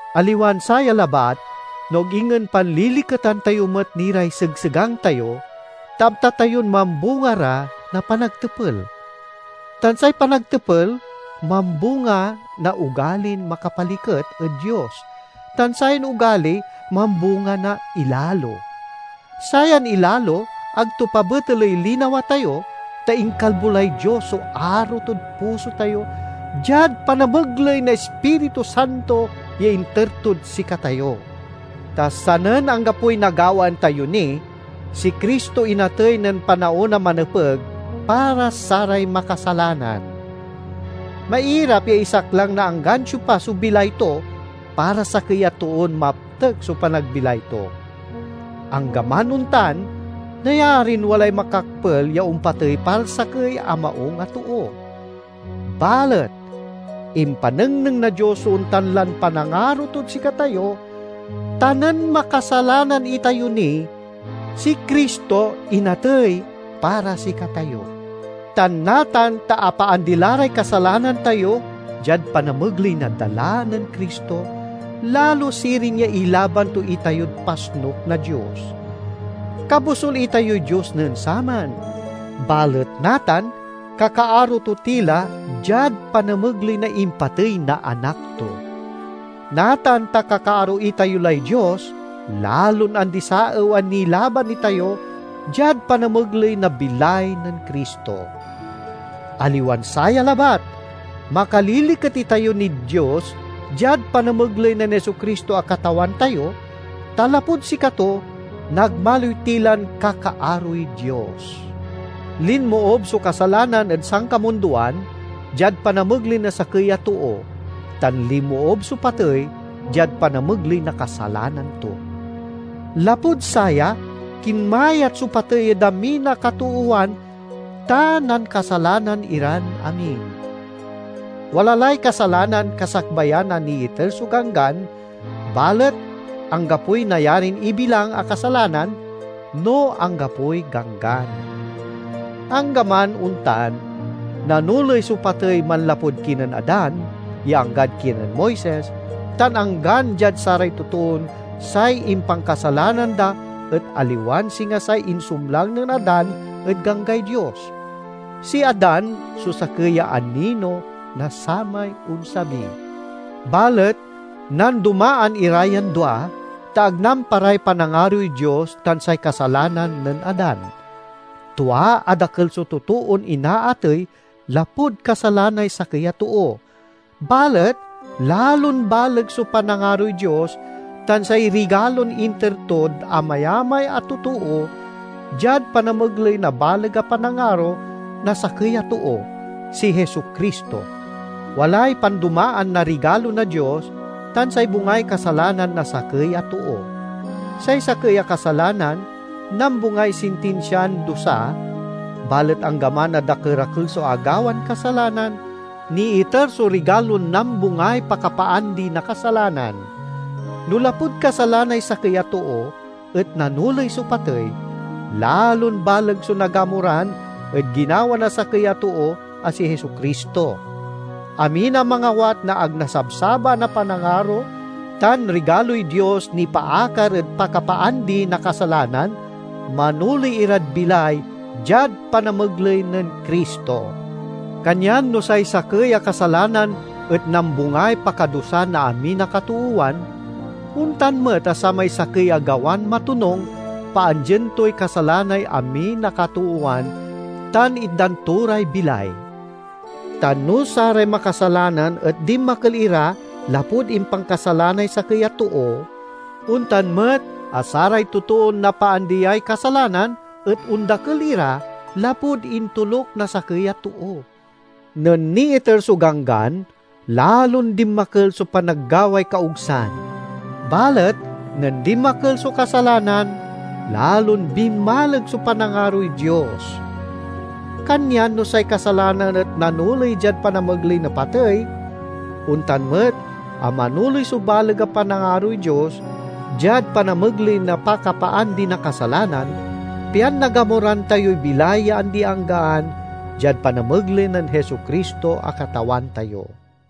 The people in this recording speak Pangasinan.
Aliwan saya labat, no ag ingen panliliketan tayo met ni ray segsegang tayo, ta amta tayon mambunga ra na panagtepel. Tan say panagtepel mambunga na ogalin makapaliket ed Dios, tan sayan ogali mambunga na ilalo. Sayan ilalo ag to pabeteley linawa tayo, ta inkalbo lay Dios so aro tod puso tayo diad panamegley na Ispiritu Santo ya inter tod sikatayo. Ta sanen anggapoy nagawaan tayo ni, si Cristo inatey nen panaon a manepeg para saray makasalanan. Mairap ya isaklang na anggan siopa so bilay to para sakey a toon maptek so panagbilay to. Anggaman ontan, nayarin walay makakpel ya ompatey para sakey a maung a too. Balet impanengneng na Dios so ontan lan panangaro tod sikatayo, ta nen makasalanan itayo ni, si Cristo inatey para sikatayo. Tan natan ta apaandi la ray kasalanan tayo diad panamegley na dala nen Cristo, lalo sirin ya ilaban to itayod pasnuk na Dios. Kabosul itayoy Dios nen saman, balet natan kakaaro to ti la diad panamegley na impatey na Anak to. Natan ta kakaaro itayo lay Dios, lalon andi-saew a nilaban itayo diad panamegley na bilay nen Cristo! Aliwan saya labat, makaliliket itayo nid Dios diad panamegley nen Jesu-Cristo a Katawan tayo, ta lapud sikato nagmaliw ti lan kakaaroy Dios. Linmoob so kasalanan ed sankamundoan diad panamegley na sakey a too, tan linmoob so patey diad panamegley na kasalanan to. Lapud saya kinmayat so patey ed amin a katoowan, ta nankasalanan iran amin. Wala lay kasalanan kasakbayan a niiter so Ganggan, balet anggapoy nayarin ibilang a kasalanan no anggapoy ganggan. Anggaman ontan, nanoley so patey manlapud kinen Adan ya anggad kinen Moises, tan anggan diad saray totoon say impankasalanan da et aliwan singa say insumlang nen Adan ed ganggay Dios. Si Adan so sakey ya anino na samay onsabi. Balet nandomaan ira yan dua, ta ag namparay panangaroy Dios tan say kasalanan nen Adan. Tua a dakel so totoon inaatey lapud kasalanay sakey a too. Balet lalon baleg so panangaroy Dios tan say rigalon inter tod amayamay a totoo diad panamegley na baleg a panangaro na sakey a too—si Jesu-Cristo. Walay pandomaan na rigalo na Dios tan say bungay kasalanan na sakey a too. Say sakey a kasalanan nambungay sintinsian dusa, balet anggaman a dakerakel so agawan kasalanan, niiter so rigalon nambungay pakapaandi na kasalanan. No lapud kasalanay sakey a too et nanoley so patey, lalon baleg so nagamuran ed ginawa na sakey a too a si Jesu-Cristo! Amin a mangawat na ag nasabsabaan a panangaro tan rigaloy Dios nipaakar ed pakapaandi na kasalanan, manoley irad bilay diad panamegley nen Cristo. Kanyan no say sakey a kasalanan et nambungay pakadusa na amin a katoowan, ontan met a samay sakey a gawan matonung paandien toy kasalanay amin a katoowan tan itdan to ray bilay. Tan no saray makasalanan et dinmakel ira lapud impankasalanay sakey a too, ontan met a saray totoon napaandiay kasalanan et ondakel ira lapud intoluk na sakey a too. Nen niiter so Ganggan, lalon dinmakel so panaggaway kaogsan. Balet nen dinmakel so kasalanan, lalon binmaleg so panangaroy Dios. Kanyan no say kasalanan et nanoley diad panamegley na patey, ontan met a manoley so baleg a panangaroy Dios diad panamegley na pakapaandi na kasalanan, pian nagamuran tayoy bilay ya andi-anggaan diad panamegley nen Jesu-Cristo a Katawan tayo.